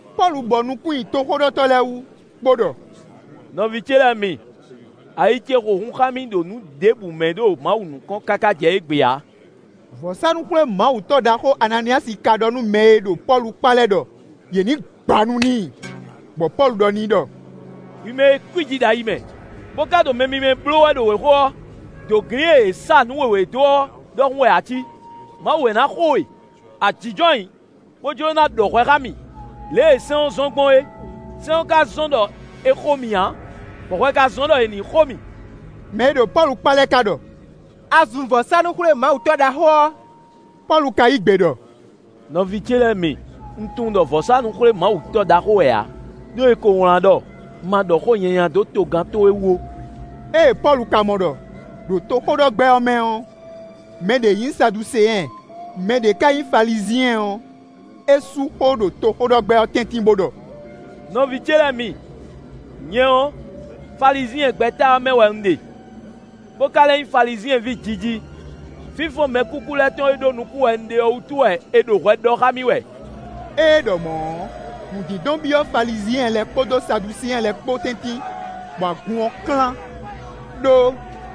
Pɔ́lu bɔ nukún nyi toxóɖɔtɔ́ lɛ́ɛ wú, bó ɖɔ: “Nɔví ce lɛ́ɛ mi, ayi ce xo hun xá mì ɖo nǔ ɖěbǔ mɛ ɖo Mawu nukɔn káká jɛ égbé ǎ.” Vɔ̌sánú-xwlémawutɔ́ ɖaxó Ananíyasi ka ɖɔ nú mɛ e ɖo Pɔ́lu kpá lɛ́ɛ ɖɔ yě ní gba nu n'i, bɔ Pɔ́lu ɖɔ n'i ɖɔ: “Hwi mɛ e kwíji ɖo ayi mɛ, bó ka ɖo mɛ mímɛ́ bló wɛ ɖo wěxo ɔ́, dǒglin e è sá nǔ wěwé dó ɔ́ ɖɔhun wɛ a cí; Mawu wɛ ná xo we; a jínjɔ́n ayǐ, bó jló ná ɖɔ hwɛ xá mì lě e sɛ́n ɔ́ zɔ́n gbɔn é; sɛ́n ɔ́ ka zɔ́n ɖɔ è xo mì ǎ, bɔ hwɛ ka zɔ́n ɖɔ è ní xo mì.” Mɛ e ɖo Pɔ́lu kpá lɛ́ɛ ka ɖɔ: “A zun vɔ̌sánú-xwlémawutɔ́ ɖaxó ɔ́!” Pɔ́lu ka yí gbe ɖɔ: “Nɔví ce lɛ́ɛ mi, un tunwun ɖɔ vɔ̌sánú-xwlémawutɔ́ ɖaxó wɛ ǎ; ɖó è ko wlán ɖɔ: ‘Ma ɖɔ xó nyanya dó togán towe wú ó.’” Ée Pɔ́lu ka mɔ ɖɔ, ɖo toxóɖɔgbɛ́ ɔ́ mɛ ɔ́, mɛ ɖě nyí Saduseɛn, mɛ ɖě ka nyí Falizyɛn ɔ́, é sú xó ɖo toxóɖɔgbɛ́ ɔ́ tɛ́ntin, bó ɖɔ: “Nɔví ce lɛ́ɛ mi, nyɛ ɔ́, Falizyɛn gbɛ́ta ɔ́ mɛ wɛ un ɖe, bó ka lɛ́ nyí Falizyɛn ví jiji. Fínfɔ́n mɛkúkú lɛ́ɛ tɔn e ɖó nukún wɛ un ɖe ɔ́ wútu wɛ è ɖo hwɛ ɖɔ xá mì wɛ.” Ée é ɖɔ mɔ̌ ɔ́, nǔdindɔn byɔ́ Falizyɛn lɛ́ɛ kpódó Saduseɛn lɛ́ɛ kpó tɛ́ntin, bɔ agun ɔ́ klán. (Đó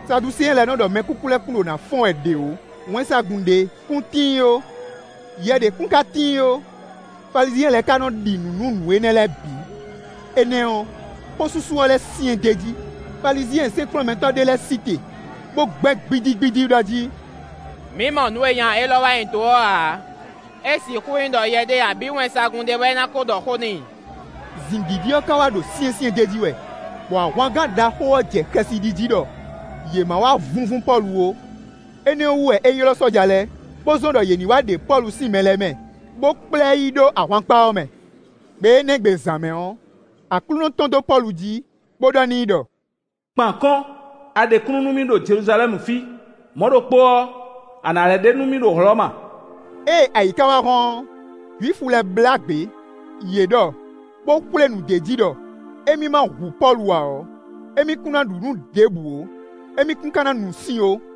Saduseɛn lɛ́ɛ nɔ ɖɔ mɛkúkú lɛ́ɛ kún ɖo ná fɔ́n wɛ ɖě ó; wɛnsagun ɖě kún tíin ó; yɛ ɖě kún ka tíin ó; Falizyɛn lɛ́ɛ ka nɔ ɖi nǔ nú nǔ énɛ́ lɛ́ɛ bǐ.) Énɛ́ ɔ́, xósúsú ɔ́ lɛ́ syɛ́n d'é jí; Falizyɛn sɛ́nkplɔ́nmɛtɔ́ ɖé lɛ́ɛ sí te, bó gbɛ́ gbídígbídí ɖɔ jí: “Mǐ mɔ nǔ e nya élɔ́ wa nyi do ɔ́ ǎ; é sixú nyí ɖɔ yɛ ɖé abǐ wɛnsagun ɖé wɛ ná ko ɖɔ xó n'i.” Zǐngídi ɔ́ ka wá ɖo syɛ́nsyɛ́n d'é jí wɛ, bɔ ahwangán ɖaxó ɔ́ jɛ xɛsi ɖi jí ɖɔ yě ma wá vúnvún Pɔ́lu ó, énɛ́ ɔ́ wú wɛ é ylɔ́ sɔ́ja lɛ́ɛ, bó zɔ́n ɖɔ yě ní wá ɖe Pɔ́lu sín mɛ lɛ́ɛ mɛ, bó kplá ɛ yi ɖó ahwankpá ɔ́ mɛ. Gbe énɛ́ gbe zǎn mɛ ɔ́, Aklúnɔ tɔ́n dó Pɔ́lu jí, bó ɖɔ n'i ɖɔ: “Kpan akɔ́n; a ɖe kúnnu nú mì ɖo Jeluzalɛ́mu fí; mɔ̌ ɖokpó ɔ́, a nǎ lɛ́ ɖe nú mì ɖo Hlɔ̌ma.” Ée ayǐ ka wá hɔ́n ɔ́, Jwifu lɛ́ɛ blá gbě; yě ɖɔ, bó xwlé nǔ d'é jí ɖɔ, émí ma hu Pɔ́lu ǎ ɔ́, émí kún ná ɖu nǔ ɖěbǔ ó, émí kún ka ná nu sin ó.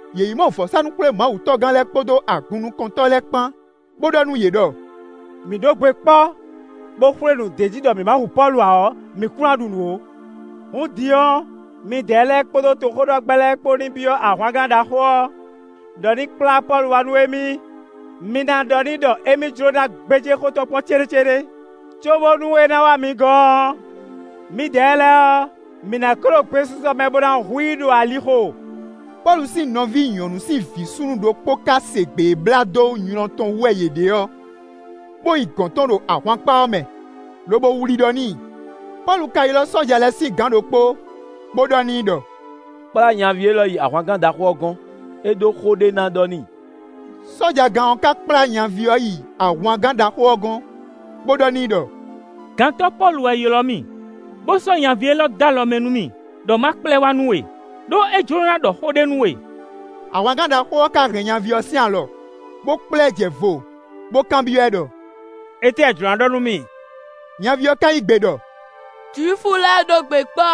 Yě yi mɔ vɔ̌sánú-xwlémawutɔ́gán lɛ́ɛ kpódó agunnukɔntɔ́ lɛ́ɛ kpán, bó ɖɔ nú yě ɖɔ: “Mǐ ɖó gbe kpɔ́, bó xwlé nǔ d'é jí ɖɔ mǐ ma hu Pɔ́lu ǎ ɔ́, mǐ kún ná ɖu nǔ ó. Hǔn din ɔ́, midɛɛ lɛ́ɛ kpódó toxóɖɔgbɛ́ lɛ́ɛ kpó ní byɔ́ ahwangán ɖaxó ɔ́ ɖɔ ní kplá Pɔ́lu wá nú émí; mi ná ɖɔ n'i ɖɔ émí jló ná gbéjé xó tɔn kpɔ́n céɖécéɖé. Cóbónú é ná wá mi gɔ́n ɔ́, mǐdɛɛ lɛ́ɛ ɔ́, mǐ nǎ ko ɖo gbesisɔ mɛ bó ná hu i ɖo alixo.” Pɔ́lu sín nɔví nyɔ̌nu sín vǐ súnnu ɖokpó ka se gbě e blá dó nylɔ́ tɔn wú wɛ yě ɖe ɔ́, bó yi gɔ̌n tɔn ɖo ahwankpá ɔ́ mɛ, lobo wlí ɖɔ n'i. Pɔ́lu ka ylɔ́ sɔ́ja lɛ́ɛ sín gǎn ɖokpó, bó ɖɔ n'i ɖɔ: “Kplá nyaví élɔ́ yi ahwangán ɖaxó ɔ́ gɔ́n; é ɖó xó ɖé ná ɖɔ n'i.” Sɔ́jagán ɔ́ ka kplá nyaví ɔ́ yi ahwangán ɖaxó ɔ́ gɔ́n, bó ɖɔ n'i ɖɔ: “Gantɔ́ Pɔ́lu wɛ ylɔ́ mì, bó sɔ́ nyaví élɔ́ dó alɔ mɛ nú mì ɖɔ ma kplá ɛ wá nú we, ɖó é jló ná ɖɔ xó ɖé nú we.” Ahwangán ɖaxó ɔ́ ka hɛn nyaví ɔ́ sín alɔ, bó kplá ɛ jɛ vo, bó kanbyɔ́ ɛ ɖɔ: “Étɛ́ a jlǒ ná ɖɔ nú mì?” Nyaví ɔ́ ka yí gbe ɖɔ: “Jwifu lɛ́ɛ ɖó gbe kpɔ́,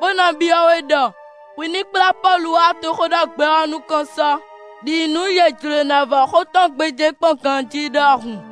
bó ná byɔ́ we ɖɔ hwi ní kplá Pɔ́lu wá toxóɖɔgbɛ́ ɔ́ nukɔn sɔ, ɖi nǔ yě jló ná vɔ́ xó tɔn gbéjé kpɔ́n ganjí ɖɔhun.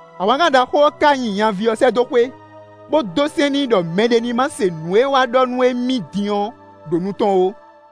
Ahwangán ɖaxó ɔ́ ka nyi nyaví ɔ́ sɛ́ dó xwé, bó dó sɛ́n n'i ɖɔ mɛɖé ní ma se nǔ e é wá ɖɔ nú émí din ɔ́ ɖo nu tɔn ó.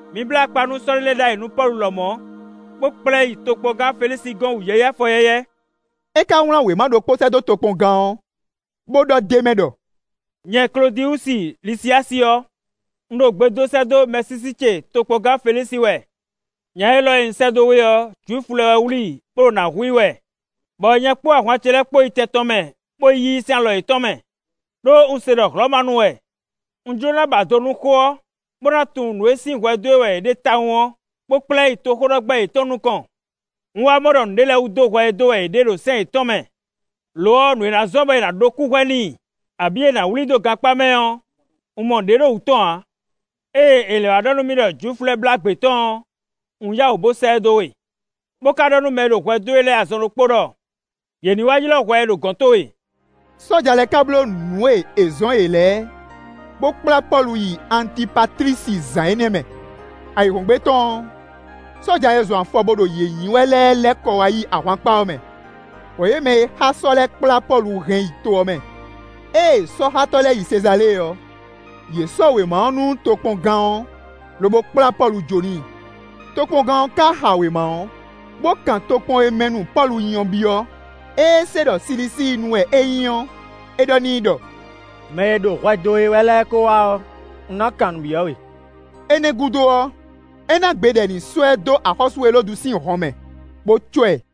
Mi blá akpa nú sɔ́ ɖé lɛ́ɛ ɖ'ayǐ nú Pɔ́lu lɔmɔ̌, bó kplá ɛ yi tokpɔngán Felísi gɔ́n wǔyɛ́yɛ́ afɔyɛ́yɛ́.” É ka wlán wěma ɖokpó sɛ́ dó tokpɔngán ɔ́, bó ɖɔ d'é mɛ ɖɔ: “Nyɛ Klódiwusi Lisiyási ɔ́, un ɖo gbe dó sɛ́ dó mɛsísí ce tokpɔngán Felísi wɛ. Nya élɔ́ e un sɛ́ dó we ɔ́, Jwifu lɛ́ɛ wɛ wlí i, bó ɖo nǎ hu i wɛ, bɔ nyɛ kpódó ahwan ce lɛ́ɛ kpó yi tɛn tɔn mɛ, bó yí i sín alɔ yětɔn mɛ, ɖó un se ɖɔ Hlɔ̌manu wɛ. Un jló ná ba do nú xó ɔ́, bó ná tunwun nǔ e sín hwɛ dó e wɛ yě ɖe tawun ɔ́, bó kplá ɛ yi toxóɖɔgbɛ́ yětɔn nukɔn. Un wá mɔ ɖɔ nǔɖé lɛ́ɛ wú dó hwɛ ɛ dó wɛ yě ɖe, ɖo sɛ́n yětɔn mɛ. Lo ɔ́, nǔ e na zɔ́n bɔ è nǎ ɖó kúhwɛ n'i, abǐ è nǎ wlí i dó gankpá mɛ ɔ́, un mɔ ɖě ɖo wǔ tɔn ǎ. Ée è lɛ́ wá ɖɔ nú mì ɖɔ Jwifu lɛ́ɛ blá gbě tɔn ɔ́, un yǎ wǔ bo sɛ́ ɛ dó we, bó ka ɖɔ nú mɛ e ɖo hwɛ dó e wɛ lɛ́ɛ azɔn ɖokpó ɖɔ yě ní wá ylɔ́ hwɛ ɛ ɖo gɔ̌n towe.” Sɔ́ja lɛ́ɛ ka bló nǔ e è zɔ́n yě lɛ́ɛ, bó kplá Pɔ́lu yi Antipatlisi zǎn énɛ́ mɛ. Ayǐhɔ́ngbe tɔn ɔ́, sɔ́ja e zɔn afɔ bo ɖo yě nyi wɛ lɛ́ɛ lɛ́ kɔ wá yi ahwankpá ɔ́ mɛ, bɔ yě mɛ e xá sɔ́ lɛ́ɛ kplá Pɔ́lu hɛn yi to ɔ́ mɛ. Ée sɔ́xátɔ́ lɛ́ɛ yi Sezalée ɔ́, yě sɔ́ wěma ɔ́ nú tokpɔngán ɔ́, lobo kplá Pɔ́lu jó n'i. Tokpɔngán ɔ́ ka xa wěma ɔ́, bó kan tokpɔn e mɛ nu Pɔ́lu nyí ɔ́ byɔ́. Ée é se ɖɔ Silisíinu wɛ é nyí ɔ́, é ɖɔ n'i ɖɔ: “Mɛ e ɖo hwɛ dó we wɛ lɛ́ɛ ko wá ɔ́, un ná kan nǔ byɔ́ we.” Énɛ́ gúdo ɔ́, é ná gbe ɖɔ è ní sɔ́ ɛ dó axɔ́sú Elódu sín hɔnmɛ, bó cɔ́ ɛ.